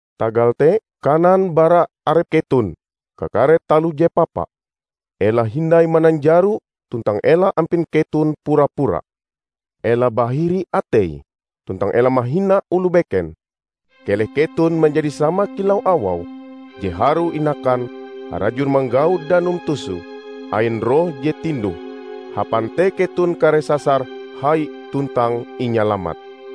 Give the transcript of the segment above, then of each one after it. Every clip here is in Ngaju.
Tagal te, kanan bara arep keton kakare taloh je papa; ela hindai mananjaro tuntang ela ampin keton pura-pura. Ela bahiri atei tuntang ela mahina oloh beken. Keleh keton manjadi sama kilau awau je harue inakan, harajur manggau danum toso ain roh je tinduh. Hapan te keton kareh sasar hai tuntang inyalamat.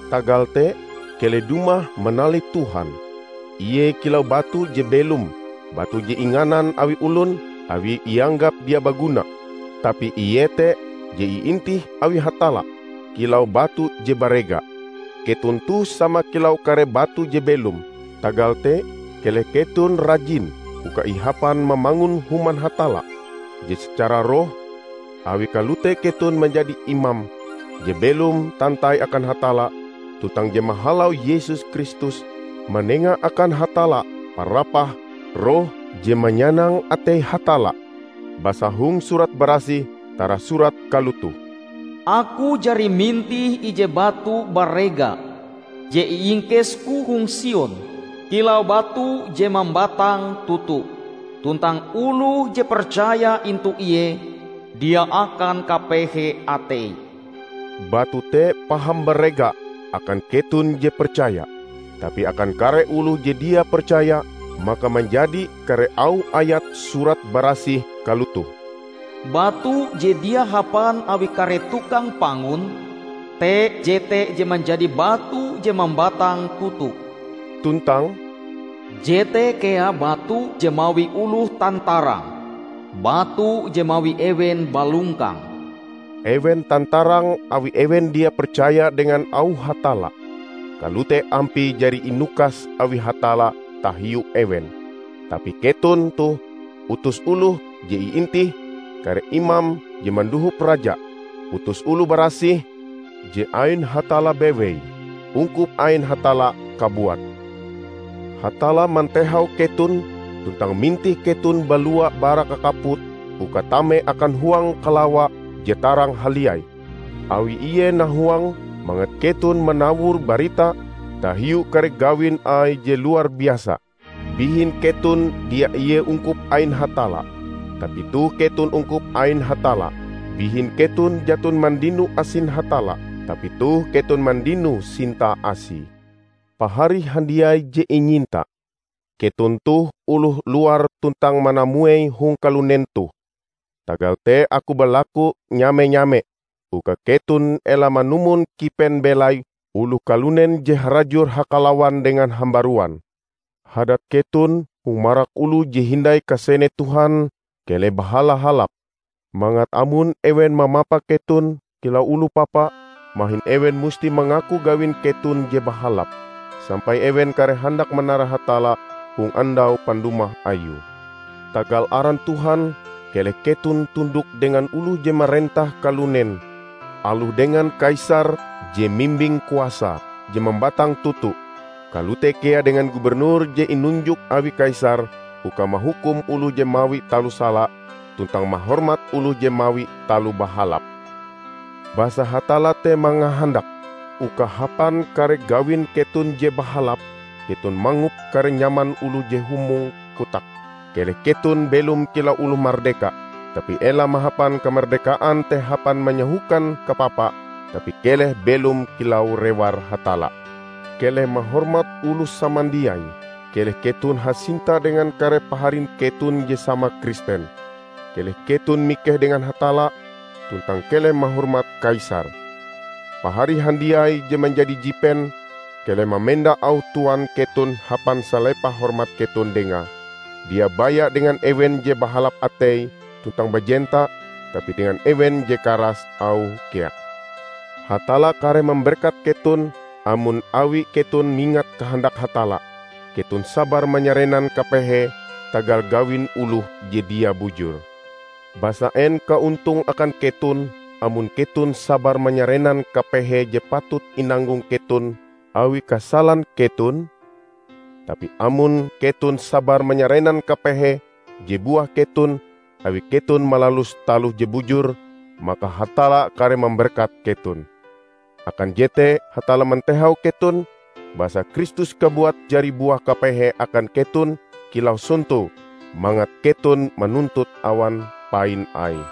Tagal te, keleh dumah manalih Tuhan. Ie kilau batu je belom, batu je inganan awi olon awi ianggap dia baguna; tapi ie te je iintih awi Hatalla kilau batu je barega. Keton toh sama kilau kare batu je belom. Tagal te keleh keton rajin uka ihapan mamangun human Hatalla je secara roh. Awi kalote keton manjadi imam je belom tantai akan Hatalla tuntang je mahalau Yesus Kristus manenga akan Hatalla parapah roh je manyanang atei Hatalla. Basa hong Surat Barasih tarasurat kalotoh, "Aku jari mintih ije batu barega, je iingkesku hong Sion kilau batu je mambatang toto; tuntang oloh je percaya intu Ie dia akan kapehe ateie." Batu te paham barega akan keton je percaya. Tapi akan kare oloh je dia percaya, maka manjadi kare auh ayat Surat Barasih kalotoh, "Batu je dia hapan awi kare tukang pangun te jete je manjadi batu je mambatang toto," tuntang "Jete kea batu je mawi oloh tantarang, batu je mawi ewen balongkang." Ewen tantarang awi ewen dia percaya dengan auh Hatalla. Kalote ampie jari inukas awi Hatalla tahiu ewen. Tapi keton toh utus oloh je iintih, kare imam je mandohop raja, utus oloh barasih, je ain Hatalla bewei, ungkup ain Hatalla kabuat. Hatalla mantehau keton tuntang mintih keton balua bara kakaput uka tame akan huang kalawa je tarang haliai, awi ie nahuang mangat keton manawur barita tahiu kare gawin Aie je luar biasa. Bihin keton dia ie ungkup ain Hatalla, tapi toh keton ungkup ain Hatalla. Bihin keton jaton mandino asin Hatalla, tapi toh keton mandino Sintae Asie. Pahari handiai je inyinta! Keton toh oloh luar tuntang manamuei hong kalunen toh. Tagal te aku balaku nyame-nyame uka keton ela manumon kipen belai oloh kalunen je harajur hakalawan dengan hambaruan. Hadat keton hong marak oloh je hindai kasene Tuhan keleh bahala-halap, mangat amon ewen mamapa keton kilau oloh papa, mahin ewen musti mangaku gawin keton je bahalap, sampai ewen kareh handak manara Hatalla hong andau pandumah ayue. Tagal aran Tuhan, keleh keton tundok dengan oloh je marentah kalunen: aloh dengan kaisar je mimbing kuasa je mambatang toto, kalote kea dengan Gubernur je inunjuk awi kaisar uka mahukum oloh je mawi taloh sala tuntang mahormat oloh je mawi taloh bahalap. Basa Hatalla te mangahandak uka hapan kare gawin keton je bahalap keton mangop kare nyaman oloh je humong kotake. Keleh keton belom kilau oloh mardeka, tapi ela mahapan kamardekaan te hapan manyahokan kapapa, tapi keleh belom kilau rewar Hatalla. Keleh mahormat oloh samandiai, keleh keton hasinta dengan kare paharin keton je sama Kristen. Keleh keton mikeh dengan Hatalla, tuntang keleh mahormat Kaisar. Pahari handiai je manjadi jipen, keleh mamenda auh tuan keton hapan salepah hormat keton dengae; dia baya dengan ewen je bahalap ateie tuntang bajenta, tapi dengan ewen je karas auhe kea. Hatalla kareh mamberkat keton, amon awi keton mingat kahandak Hatalla, keton sabar manyarenan kapehe tagal gawin oloh je dia bujur. Basa en kaontonge akan keton amon keton sabar manyarenan kapehe je patut inanggong keton awi kasalan keton? Tapi amon keton sabar manyarenan kapehe je buah keton awi keton malalus taloh je bujur, maka Hatalla kareh mamberkat keton. Akan jete Hatalla mantehau keton. Basa Kristus kabuat jari buah kapehe akan keton kilau sonto, mangat keton manuntut awan pain Aie.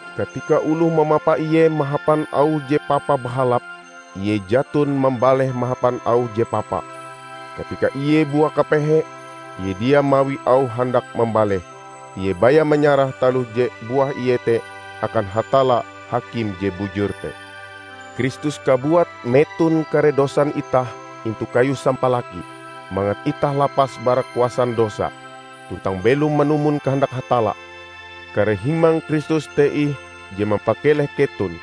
Katika oloh mamapa ie mahapan auh je papa bahalap, ie jaton mambaleh mahapan auh je papa. Katika ie buah kapehe, ie dia mawi auh handak mambaleh; ie baya manyarah taloh je buah ie te akan Hatalla, Hakim je bujur te. Kristus kabuat meton kare dosan itah intu kayu sampalaki, mangat itah lapas bara kuasan dosa, tuntang belom manumon kahandak Hatalla. Kare himang Kristus te ih je mampakeleh keton.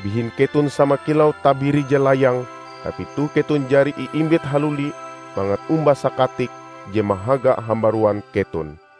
Bihin keton sama kilau tabiri je layang, tapi toh keton jari iimbit haluli mangat omba Sakatik Je Mahaga hambaruan keton.